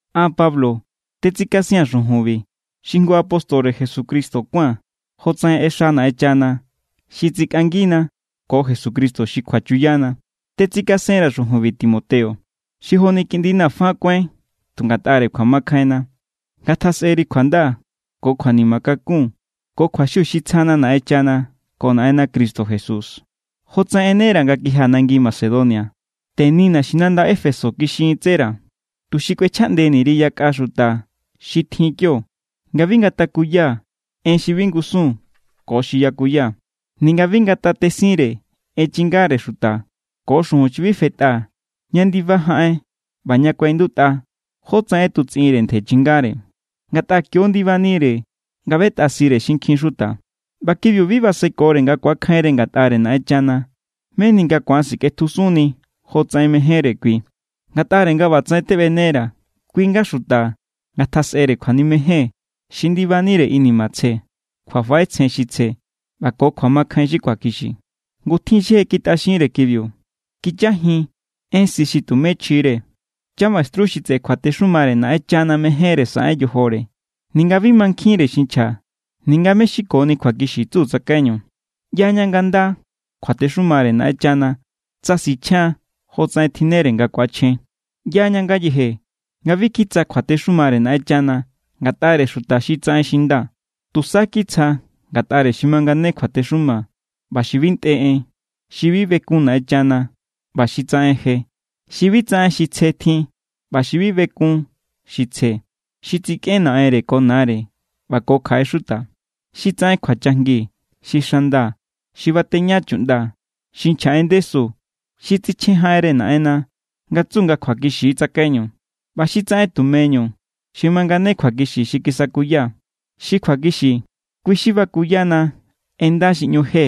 An, Pablo, tetsikasia̱n xujunbi, xi jngu apóstore Jesucristo kuáa̱n jotsaꞌen ꞌexa Naꞌenchana xi tsikꞌangina ko Jesucristo xi kjuachuyana. Tetsikasenra̱ xujunbi, Timoteo, xi joni kiꞌndina̱ fa kuáin tu ngatꞌare kjuamakjainna. Ngatjasꞌeri kjuanda ko kjuanima kakun ko kjuaxiu xi tsjana Naꞌenchana ko Naꞌenna Cristo Jesús. Jotsaꞌen ꞌenera̱ nga kijia̱ nangi Macedonia, teni naxinanda Éfeso kixintsera̱, tuxi kꞌuechjaꞌndeni_ri yakꞌa xuta xi tjin kionga bi ngatakuya en xi bi ngusun ko xi yakuya. Ninga bi ngatatesinre en chingare xuta ko xujun xi bi fetꞌa ña ndiba jaꞌen ꞌba ña kuaꞌindutꞌa jótsaꞌen ꞌetutsꞌinnire ntje chingare. Ngatꞌa kio= ndibanire nga ꞌbetꞌasire xinkjin xuta. ꞌBa kibiu bi basekore nga ku̱akjainre ngatꞌare Naꞌenchana meni nga ku̱an sikꞌetjusunni jotsaꞌen mejénre kui. Ngatꞌare nga ꞌbatsaꞌen teꞌbenera̱, kui= nga xuta ngatjasꞌere kjuanimejen xi ndibanire inima tsje, kjuafaꞌetsjen xi tsje, ꞌba ko kjuamakjain xi kjuakixi. Ngu tjin= xi je kitꞌaxinre kibiu. Kichajin en si xi tumé chjire. Chamaestru xi tseꞌe kjuatexumare Naꞌenchana mejénre saꞌen yojore, ninga bi mankjinre xi nchja ninga mé= xi koni kjuakixi tsu tsakaiñu. ꞌYaña nga nda= kjuatexumare Naꞌenchana tsa sichjian jotsaꞌen tjinnere nga ku̱achjen. ꞌYaña ngayeje nga bi kitsja kjuatexumare Naꞌenchana ngatꞌare xuta xi tsaꞌen xi nda. Tusa kitsja ngatꞌare xi mangane kjuatexuma ꞌba xi bi ntꞌe en, xi bi bekun Naꞌenchana ꞌba xi tsaꞌen je, xi bi tsaꞌen xi tsje tjin ꞌba xi bi bekun xi tsje, xi tsikꞌen naꞌenre ko nare ꞌba ko kjaꞌe xuta, xi tsaꞌen kjuachajngi, xi xanda, xi bateña chuꞌnda, xi nchja en ndesu, xi tsichjen jaꞌenre Naꞌenna nga tsu nga kjuakixi= tsakaiñu, ꞌba xi tsaꞌen tumeñu xi mangane kjuakixi xi kisakuyaa̱. Xi kjuakixi, kui xi bakuyana en nda xi ꞌñu je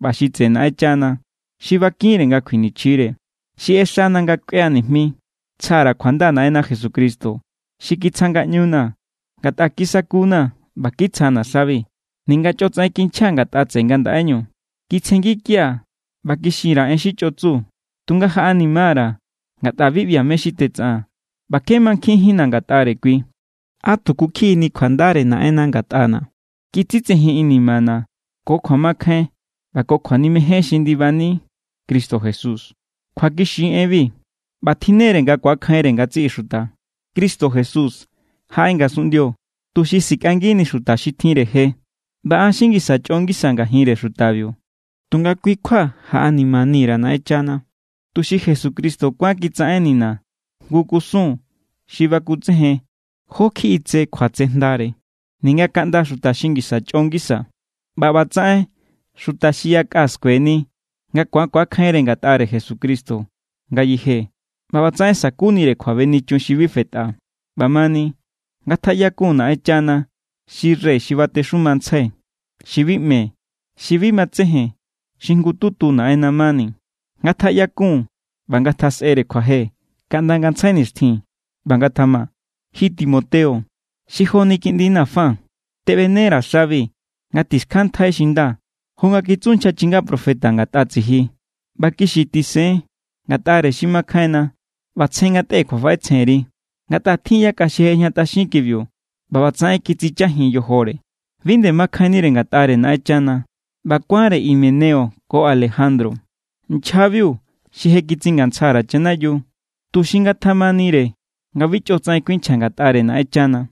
ꞌba xi tseꞌe Naꞌenchana xi bakinre nga kjuinichjire. Xi ꞌexana̱ nga kuiꞌaa̱ nijmi. Tsja_ra̱ kjuanda Naꞌenna Jesucristo, xi kitsja ngaꞌñuna̱, ngatꞌa kiskunna̱ ꞌba kitsjana̱ xabi, ninga chꞌotsaꞌen kinchjaa̱ ngatꞌa tseꞌe ngandaꞌeñu. Kitsjengikia̱ ꞌba kixin_ra̱ en xi chꞌo tsu. Tunga jaꞌanima_ra̱ ngatꞌa bi ꞌbia̱ mé= xi tetsaꞌaa̱n ꞌba kje makjainjínna̱ ngatꞌare kui. ¡Á tuku kjiꞌini kjuandare Naꞌenna ngatꞌana̱! Kitsitsejin inimana̱ ko kjuamakjain ꞌba ko kjuanimejen xi ndibani Cristo Jesús. Kjuakixi= enbi ꞌba tjinne=re nga ku̱akjainre ngatsiꞌi xuta. Cristo Jesús jaꞌe ngasunꞌndio tuxi sikꞌangini xuta xi tjinre je. ꞌBa an xi ngisa chꞌo ngisaa̱ ngajinre xutabiu. Tunga kui= kjua jaꞌanima_ra̱ Naꞌenchana, tuxi Jesucristo kuán kitsaꞌennina̱ jngu kusun xi bakutsejen jó= kjiꞌi tse kjuatsejndare ninga kaꞌnda xuta xi ngisa chꞌo ngisa. ꞌBa ꞌbatsaꞌen xuta xi yakꞌa skueni nga ku̱an ku̱akjainre ngatꞌare Jesucristo ngayeje ꞌba ꞌbatsaꞌen sa̱kunire kjuabenichun xi bi fetꞌa. ꞌBamani, ¡ngatjaꞌyakun Naꞌenchana xi rey xi batexumantsjai, xi bi ꞌme, xi bi matsejen, xi jngututu Naꞌenna mani! ¡Ngatjaꞌyakun ꞌba ngatjasꞌere kjuaje kaꞌnda ngantsjai nixtjin! ꞌBa ngatjama. Ji Timoteo, xi joni kiꞌndina̱ fa, teꞌbenera̱ xabi nga tixkjantꞌai xi nda, jo nga kitsu nchja chinga profeta ngatꞌa tsiji. ꞌBa kixi tisen ngatꞌare xi makjainna ꞌba tsje ngatꞌe kjuafaꞌetsjenri. Ngatꞌa tjin yakꞌa xi je ꞌejñatꞌaxin kibiu ꞌba ꞌbatsaꞌen kitsichajin yojore. Bi nde makjainnire ngatꞌare Naꞌenchana. ꞌBa kuánre Himeneo ko Alejandro, nchjabiu xi je kitsingantsja_ra̱ chanayiu, tuxi ngatjamanire nga bi chꞌotsaꞌen kuinchja ngatꞌare Naꞌenchana.